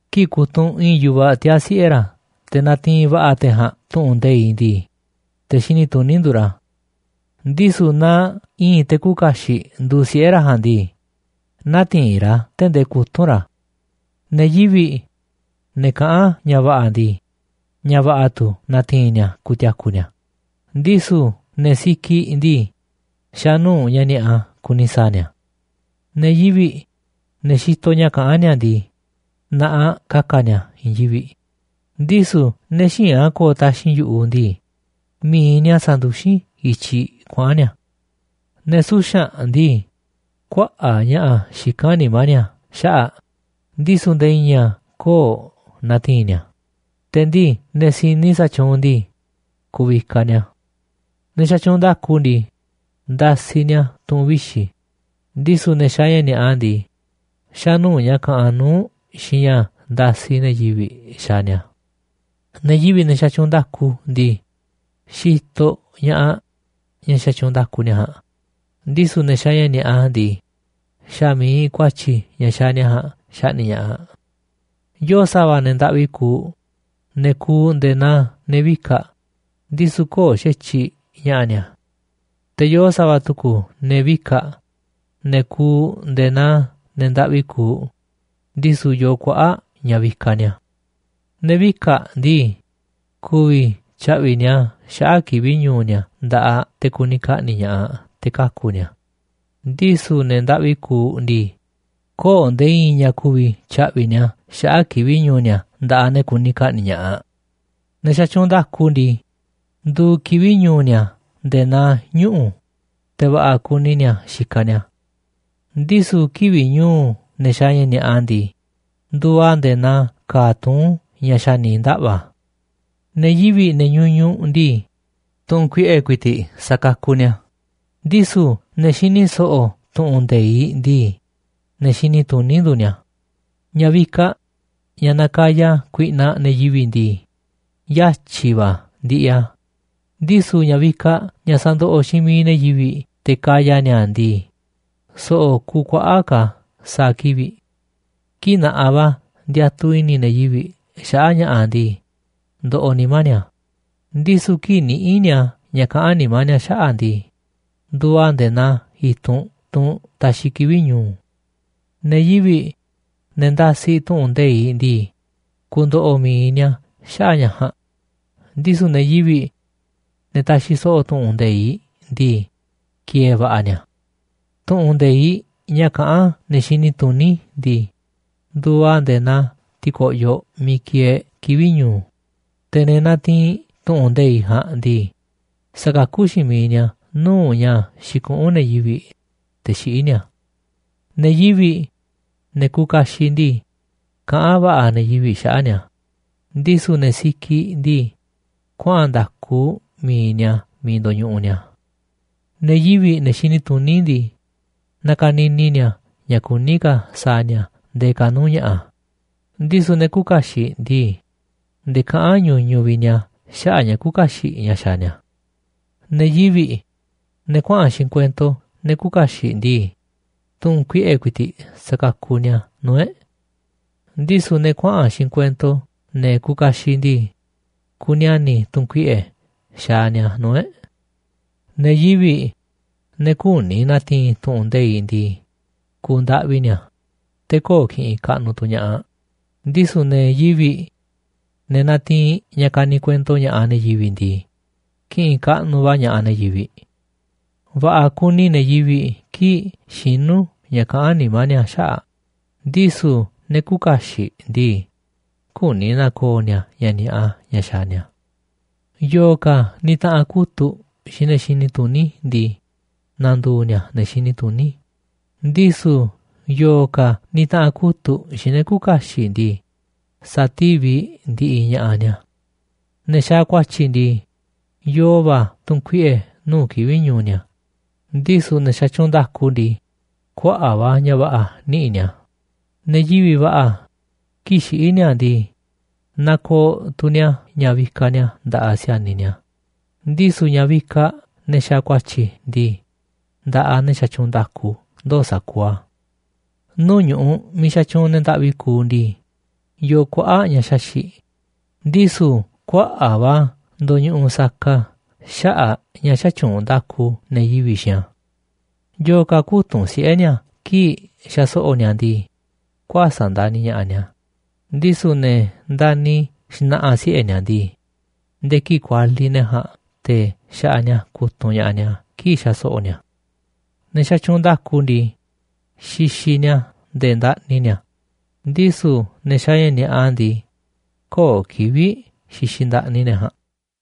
Kii̱ꞌ kutunꞌ i̱i̱n yu̱vaꞌ tiaa̱ siꞌe̱ ra̱ te̱ natiinꞌ va̱ꞌa̱ te̱ ja̱a̱nꞌ tu̱ꞌu̱n nde̱iꞌ ndii, te̱ xini tuní nduuꞌ ra̱, ndisu̱ naaꞌ i̱i̱n te̱ küuꞌ kaxiꞌ nduuꞌ siꞌe̱ ra̱ ja̱a̱nꞌ ndii, nä̱ti̱i̱n ra̱ a̱ tee̱ꞌ ndee kutu̱nꞌ ra̱. Ne̱ yivi̱ꞌ, ne̱ kaꞌán ña̱ va̱ꞌa̱ ndii, ña̱ va̱ꞌa̱ tu̱ na̱ti̱i̱n ni̱a̱ ku̱ti̱a̱ku̱ ni̱a̱, ndisu̱ ne̱ sikiꞌ ndii, xa̱ nuu̱ꞌ ña̱ ni̱a̱ꞌa kuni sa̱a̱ ni̱a̱. Ne̱ yivi̱ꞌ, ne̱ xitoꞌ ña̱ kaꞌán ni̱a̱ ndii, na̱ꞌaꞌ ka̱ka̱ ni̱a̱ i̱i̱n yivi̱ꞌ, ndisu̱ ne̱ xïinꞌ a̱ ko̱o̱ taxi̱nꞌ yu̱ꞌuꞌ ndii, mi̱iꞌ ni̱a̱ sanduxín i̱tyiꞌ kuaꞌa̱n ni̱a̱. Ne̱ suxa̱nꞌ ndii, kuaꞌa̱ꞌ ña̱ꞌa̱ xikán nimá ni̱a̱ xaꞌa̱ꞌ, ndisu̱ nde̱e̱ i̱i̱n a̱ köo̱ꞌ natiinꞌ ni̱a̱, te̱ ndii ne̱ si̱ni sa̱tyuunꞌ ndii, ku̱vikaꞌ ni̱a̱. Ne̱ xatyuunꞌ nda̱ku ndii, ndasiꞌ ni̱a̱ tu̱ꞌu̱n vixi̱, ndisu̱ ne̱ xaaꞌ ña̱ ni̱a̱ꞌa ndii, xa̱ nuu̱ꞌ ña̱ kaꞌanꞌ nuu̱ꞌ xiinꞌ ña̱ ndasiꞌ ne̱ yivi̱ꞌ xaaꞌ ni̱a̱. Ne̱ yivi̱ꞌ, ne̱ xatyuunꞌ nda̱ku ndii, xitoꞌ ña̱ꞌaꞌ ña̱ xatyuunꞌ nda̱ku ni̱a̱ ja̱a̱nꞌ, ndisu̱ ne̱ xaaꞌ ña̱ ni̱a̱ꞌa ndii, xa̱ mi̱iꞌ ku̱a̱tyi̱ ña̱ xaaꞌ ni̱a̱ ja̱a̱nꞌ xaꞌni̱ꞌ ña̱ꞌaꞌ. Yoo sa̱va̱ ne̱ ndaꞌvi kuuꞌ, ne̱ kuuꞌ nde̱e̱ naa ne̱ vika̱ꞌ, ndisu̱ köo̱ꞌ xa̱tyiꞌ ña̱ꞌa̱ ni̱a̱. Te̱ yoo sa̱va̱ tu̱ku̱ ne̱ vika̱ꞌ, ne̱ kuuꞌ nde̱e̱ naa ne̱ ndaꞌvi kuuꞌ, ndisu̱ yoo kuaꞌa̱ꞌ ña̱ vikaꞌ ni̱a̱. Ne̱ vika̱ꞌ ndii, ku̱vi̱ tya̱ꞌvi̱ ni̱a̱ xaꞌa̱ꞌ kivi̱ꞌ ñu̱u̱ ni̱a̱ nda̱ꞌaꞌ te̱ kuni ka̱ꞌni̱ꞌ ña̱ꞌaꞌ te̱ kaku̱ ni̱a̱, ndisu̱ ne̱ ndaꞌvi kuuꞌ ndii, köo̱ꞌ nde̱e̱ i̱i̱n ña̱ ku̱vi̱ tya̱ꞌvi̱ ni̱a̱ xaꞌa̱ꞌ kivi̱ꞌ ñu̱u̱ ni̱a̱ nda̱ꞌaꞌ ne̱ kuni ka̱ꞌni̱ꞌ ña̱ꞌaꞌ. Ne̱ xatyuunꞌ nda̱ku ndii, nduuꞌ kivi̱ꞌ ñu̱u̱ ni̱a̱ nde̱e̱ naa ñuꞌu̱, te̱ va̱ꞌa̱ kuni ni̱a̱ xikaꞌ ni̱a̱, ndisu̱ kivi̱ꞌ ñu̱u̱ ne̱ xaaꞌ ña̱ ni̱a̱ꞌa ndii, nduuꞌ a̱ nde̱e̱ naa ka̱a̱ tuún ña̱ xa̱ ni̱ ndaꞌva̱. Ne̱ yivi̱ꞌ, ne̱ ñuñuꞌ ndii, tu̱nkuiꞌe̱ ku̱i̱ti̱ꞌ sakakuꞌ ni̱a̱, ndisu̱ ne̱ xini so̱ꞌo̱ tu̱ꞌu̱n nde̱iꞌ ndii, te̱ xini tuní nduuꞌ ni̱a̱. Ña̱ vikaꞌ, ña̱ nakaya kuiꞌnaꞌ ne̱ yivi̱ꞌ ndii, yatyi̱ va̱ ndiꞌiꞌ a̱, ndisu̱ ña̱ vikaꞌ ña̱ sandoꞌoꞌ xiinꞌ miiꞌ ne̱ yivi̱ꞌ te̱ kaya ni̱a̱ a̱ ndii, so̱ꞌo̱ kuuꞌ kuaꞌa̱ꞌ ka̱ a̱ sa̱a̱ kivi̱ꞌ. Kii̱ꞌ na̱ꞌaꞌ va̱ ndiatuꞌ i̱ni̱ ne̱ yivi̱ꞌ xaꞌa̱ꞌ ña̱ꞌa̱ ndii, ndoꞌoꞌ nimá ni̱a̱, ndisu̱ kii̱ꞌ niꞌíꞌ ni̱a̱ ña̱ kaꞌán nimá ni̱a̱ xaꞌa̱ꞌ ndii, nduuꞌ a̱ nde̱e̱ naa i̱tunꞌ, tunꞌ taxiꞌ kivi̱ꞌ ñu̱u̱. Ne̱ yivi̱ꞌ, ne̱ ndasiꞌ tu̱ꞌu̱n nde̱iꞌ ndii, ku̱ndo̱ꞌo̱ mi̱iꞌ ni̱a̱ xaꞌa̱ꞌ ña̱ ja̱a̱nꞌ, ndisu̱ ne̱ yivi̱ꞌ, ne̱ taxiꞌ so̱ꞌo̱ tu̱ꞌu̱n nde̱iꞌ ndii, ki̱e̱e̱ va̱ꞌa̱ ni̱a̱. Tu̱ꞌu̱n nde̱iꞌ ña̱ kaꞌán ne̱ xini tuní ndii, nduuꞌ a̱ nde̱e̱ naa ti̱ko̱ꞌyoꞌ miiꞌ kieeꞌ kivi̱ꞌ ñu̱u̱, te̱ ne̱ natiinꞌ tu̱ꞌu̱n nde̱iꞌ ja̱a̱nꞌ ndii, sakakú xiinꞌ miiꞌ ni̱a̱ nuu̱ꞌ ña̱ xikuꞌún ne̱ yivi̱ꞌ, te̱ xiꞌí ni̱a̱. Ne̱ yivi̱ꞌ, ne̱ kuuꞌ kaxiꞌ ndii, kaꞌán va̱ꞌa̱ ne̱ yivi̱ꞌ xaꞌa̱ꞌ ni̱a̱, ndisu̱ ne̱ sikiꞌ ndii, kuaꞌa̱n nda̱ku mi̱iꞌ ni̱a̱ miiꞌ ndo̱ñuꞌuꞌ ni̱a̱. Ne̱ yivi̱ꞌ, ne̱ xini tuní ndii, nakanini ni̱a̱ ña̱ kuní ka̱ sa̱a̱ ni̱a̱ ndee ka̱ nuu̱ꞌ ña̱ꞌa̱, ndisu̱ ne̱ küuꞌ kaxiꞌ ndii, nde̱e̱ kaꞌán ñuñuꞌ vi̱ꞌ ni̱a̱ xaꞌa̱ꞌ ña̱ küuꞌ kaxiꞌ ña̱ xaaꞌ ni̱a̱. Ne̱ yivi̱ꞌ, ne̱ kuaꞌa̱n xiinꞌ kuento ne̱ küuꞌ kaxiꞌ ndii, tu̱n kuiꞌe̱ ku̱i̱ti̱ꞌ sakakuꞌ ni̱a̱ nuu̱ꞌ e̱ꞌ, ndisu̱ ne̱ kuaꞌa̱n xiinꞌ kuento ne̱ kuuꞌ kaxiꞌ ndii, kuniani̱ tu̱n kuiꞌe̱ xaaꞌ ni̱a̱ nuu̱ꞌ e̱ꞌ. Ne̱ yivi̱ꞌ, ne̱ küni na̱ti̱i̱n tu̱ꞌu̱n nde̱iꞌ ndii, ku̱u̱ ndaꞌvi ni̱a̱, te̱ köo̱ꞌ ki̱ꞌi̱n kaꞌnuꞌ tu̱ ña̱ꞌaꞌ, ndisu̱ ne̱ yivi̱ꞌ, ne̱ natiinꞌ ña̱ kaniꞌ kuento ña̱ꞌaꞌ ne̱ yivi̱ꞌ ndii, ki̱ꞌi̱n kaꞌnuꞌ va̱ ña̱ꞌaꞌ ne̱ yivi̱ꞌ. Va̱ꞌa̱ kuni ne̱ yivi̱ꞌ kii̱ꞌ xinú ña̱ kaꞌán nimá ni̱a̱ xaꞌa̱ꞌ, ndisu̱ ne̱ küuꞌ kaxiꞌ ndii, küni na̱ko̱o̱ ni̱a̱ ña̱ ni̱a̱ꞌa ña̱ xaaꞌ ni̱a̱. Yo̱o̱ ka̱ nitaꞌanꞌ kutu̱ꞌ xiinꞌ ne̱ xini tuní ndii, na̱ndu̱u̱ ni̱a̱ ne̱ xini tuní, ndisu̱ yo̱o̱ ka̱ nitaꞌanꞌ kutu̱ꞌ xiinꞌ ne̱ küuꞌ kaxiꞌ ndii, sati̱viꞌ ndi̱ꞌi̱ ña̱ꞌaꞌ ni̱a̱. Ne̱ xaaꞌ ku̱a̱tyi̱ ndii, yoo va̱ tu̱nkuiꞌe̱ nuu̱ꞌ kivi̱ꞌ ñu̱u̱ ni̱a̱, ndisu̱ ne̱ xatyuunꞌ nda̱ku ndii, kuaꞌa̱ꞌ va̱ ña̱ va̱ꞌa̱ niꞌi̱ꞌ ni̱a̱. Ne̱ yivi̱ꞌ va̱ꞌa̱, kii̱ꞌ xiꞌí ni̱a̱ ndii, nakooꞌ tu̱ ni̱a̱ ña̱ vikaꞌ ni̱a̱ nda̱ꞌaꞌ si̱a̱niꞌ ni̱a̱, ndisu̱ ña̱ vikaꞌ ne̱ xaaꞌ ku̱a̱tyi̱ ndii, nda̱ꞌaꞌ ne̱ xatyuunꞌ nda̱ku ndoo̱ sa̱kuuꞌ a̱. Nuu̱ꞌ ñu̱ꞌuꞌ miiꞌ xatyuunꞌ ne̱ ndaꞌvi kuuꞌ ndii, yoo kuaꞌa̱ꞌ ña̱ xaxi̱ꞌ, ndisu̱ kuaꞌa̱ꞌ va̱ a̱ ndoñuꞌuꞌ saka xaꞌa̱ꞌ a̱ ña̱ xätyuunꞌ nda̱ku ne̱ yivi̱ꞌ xiinꞌ a̱. Yo̱o̱ ka̱ kütunꞌ siꞌe̱ ni̱a̱ kii̱ꞌ xaso̱ꞌo̱ ni̱a̱ ndii, kuäsa̱ꞌ ndani̱ ña̱ꞌaꞌ ni̱a̱, ndisu̱ ne̱ ndani̱ xna̱ꞌa̱ siꞌe̱ ni̱a̱ ndii, nde̱e̱ kii̱ꞌ kualiꞌ ne̱ ja̱a̱nꞌ te̱ xaꞌaꞌ ni̱a̱ kutunꞌ ña̱ꞌaꞌ ni̱a̱ kii̱ꞌ xaso̱ꞌo̱ ni̱a̱. Ne̱ xatyuunꞌ nda̱ku ndii, xixiꞌ ni̱a̱ nde̱e̱ ndaꞌni ni̱a̱, ndisu̱ ne̱ xaaꞌ ña̱ ni̱a̱ꞌa ndii, köo̱ꞌ kivi̱ꞌ xixiꞌ ndaꞌni ne̱ ja̱a̱nꞌ.